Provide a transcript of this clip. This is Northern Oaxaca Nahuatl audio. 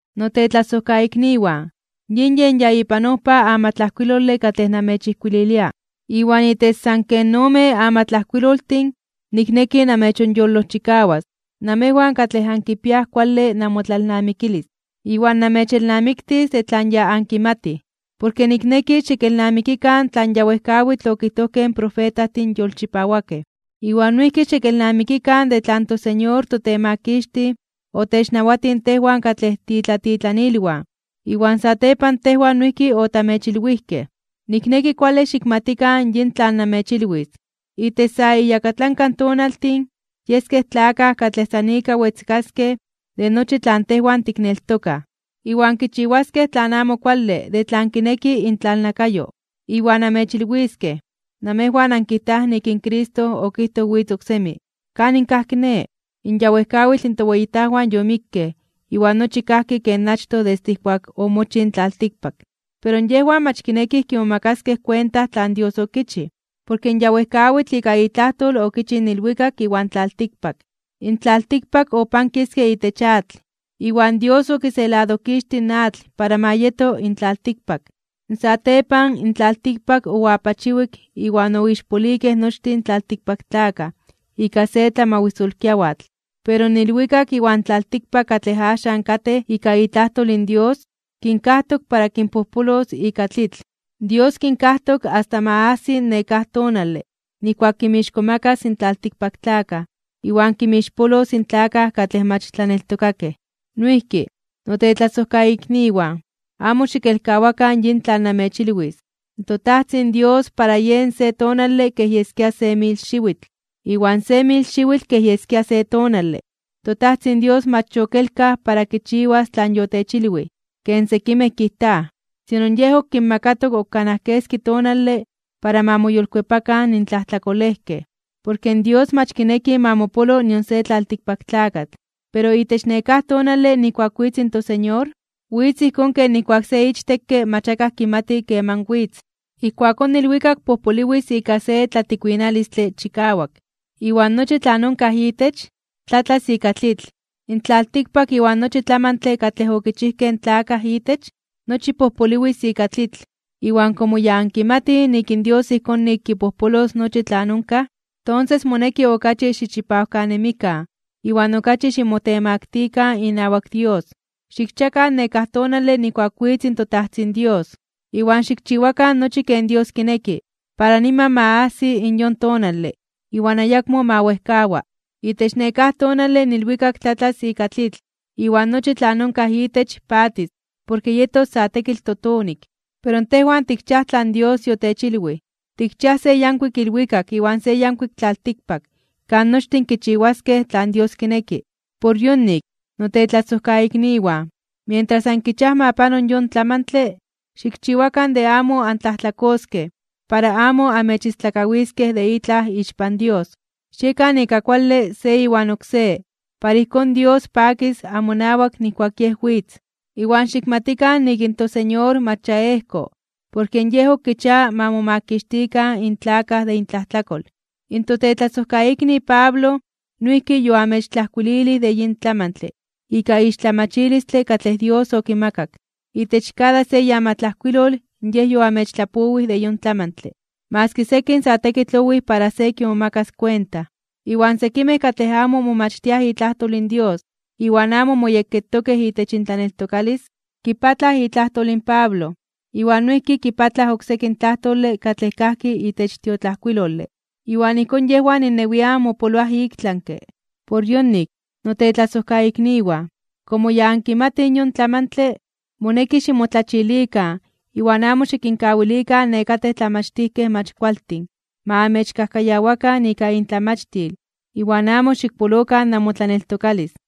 Notetlasojkaikniwan, yin yen ya ipan ojpa amatlajkuilole katlej namechijkuililia. Iwan itech san ken omen amatlajkuiloltin nikneki namechonyolojchikawas namejwan katlej ankipiaj kuale namotlalnamikilis iwan namechelnamiktis de tlan ya ankimatij. Porke nikneki xikelnamikikan tlan ya wejkawitl okijtojkej in profetajtin yolchipawakej. Iwan noijki xikelnamikikan de tlan toSeñor toTemakixtij otechnawatij tejwan katlej tiitlatitlanilwan iwan satepan tejwan noijki otamechilwijkej. Nikneki kuale xikmatikan yin tlan namechilwis. Itech sa iyakatlanka tonaltin yeskej tlakaj katlej san ika wetzkaskej de nochi tlan tejwan tikneltokaj, iwan kichiwaskej tlan amo kuale de tlan kineki intlalnakayo. Iwan amechilwiskej: “Namejwan ankijtaj nik in Cristo okijtoj witz oksemi. ¿Kanin kaj kiné? In ya wejkawitl toweyitajwan yomikkej, iwan nochi kajki ken achtoj desde ijkuak omochij in tlaltikpak.” Pero yejwan mach kinekij kimomakaskej kuenta tlan Dios okichij, porke ya wejkawitl ika itlajtol okichij in ilwikak iwan tlaltikpak. In tlaltikpak opankiske itech atl, iwan Dios okiseladojkixtij in atl para ma yeto in tlaltikpak. Satepan, in tlaltikpak oapachiwik iwan oixpolikej nochtin tlaltikpaktlakaj ika se tlamawisolkiawatl. Pero in ilwikak iwan tlaltikpak katlej axan katej ika itlajtol in Dios kinkajtok para kinpojpolos ika tlitl. Dios kinkajtok asta ma ajsi nekáj tonale nijkuak kinmixkomakas in tlaltikpaktlakaj iwan kinmixpolos in tlakaj katlej mach tlaneltokakej. Noijki, notetlasojkaikniwan, amo xikelkawakan yin tlan namechilwis. ToTajtzin Dios para Yej se tonale kej yeskia se mil xiwitl, iwan se mil xiwitl kej yeskia se tonale. ToTajtzin Dios mach yokelkaj para kichiwas tlan yotechilwij, ken sekimej kijtaj, sino Yej ok kinmakatok ok kanaj keski tonale para ma moyolkuepakan in tlajtlakolejkej. Dios mach kineki ma mopolo nion se tlaltikpaktlakatl. Pero itech nekáj tonale nijkuak witz in toSeñor, witz ijkón ken nijkuak se ichtekke mach akaj kimati keman witz. Ijkuakón ilwikak pojpoliwis ika se tlatikuinalistle chikawak, iwan nochi tlan onkaj itech, tlatlas ika tlitl. In tlaltikpak iwan nochi tlamantle katlej okichijkej in tlakaj itech, nochi pojpoliwis ika tlitl. Iwan komo ya ankimatij nik in Dios ijkón nik kipojpolos nochi tlan onkaj, tonses moneki okachi xichipawkanemikan iwan okachi ximotemaktikan (ximotemaktilikan) inawak Dios. Xikchiakan nekáj tonale nijkuak witz in toTajtzin Dios. Iwan xikchiwakan nochi ken Dios kineki para niman ma ajsi in yon tonale iwan ayakmo ma wejkawa. Itech nekáj tonale in ilwikak tlatlas ika tlitl iwan nochi tlan onkaj itech patis porke yetos sa tekitl totonik. Pero tejwan tikchiaj tlan Dios yotechilwij, tikchiaj se yankuik ilwikak iwan se yankuik tlaltikpak kan nochtin kichiwaskej tlan Dios kineki. Por yonik, notetlasojkaikniwan, mientras ankichiaj ma pano yon tlamantle, xikchiwakan de amo antlajtlakoskej para amo amechistlakawiskej de itlaj ixpan Dios. Xiekan ika kuale se iwan oksé para ijkón Dios pakis amonawak nijkuak Yej witz. Iwan xikmatikan nik in toSeñor mach ya ejko porke Yej ok kichia ma momakixtikan in tlakaj de intlajtlakol. In totetlasojkaikni Pablo noijki yoamechtlajkuililij de yin tlamantle ika ixtlamachilistle katlej Dios okimakak. Itech kada se iamatlajkuilol yej yoamechtlapowij de yon tlamantle, maski sekin sa tekitl owij para se kimomakas kuenta, iwan sekimej katlej amo momachtiaj itlajtol in Dios iwan amo moyekketokej itech intlaneltokalis, kipatlaj itlajtol in Pablo iwan noijki kipatlaj oksekin tlajtole katlej kajki itech tiotlajkuilole. Iwan ijkón yejwan innewian mopoloaj iktlanke (ik tlami). Por yonik, notetlasojkaikniwan, komo ya ankimatij yon tlamantle, moneki ximotlachilikan iwan amo xikinkawilikan nekatej tlamachtijkej mach kualtin ma amechkajkayawakan ika intlamachtil iwan amo xikpolokan namotlaneltokalis.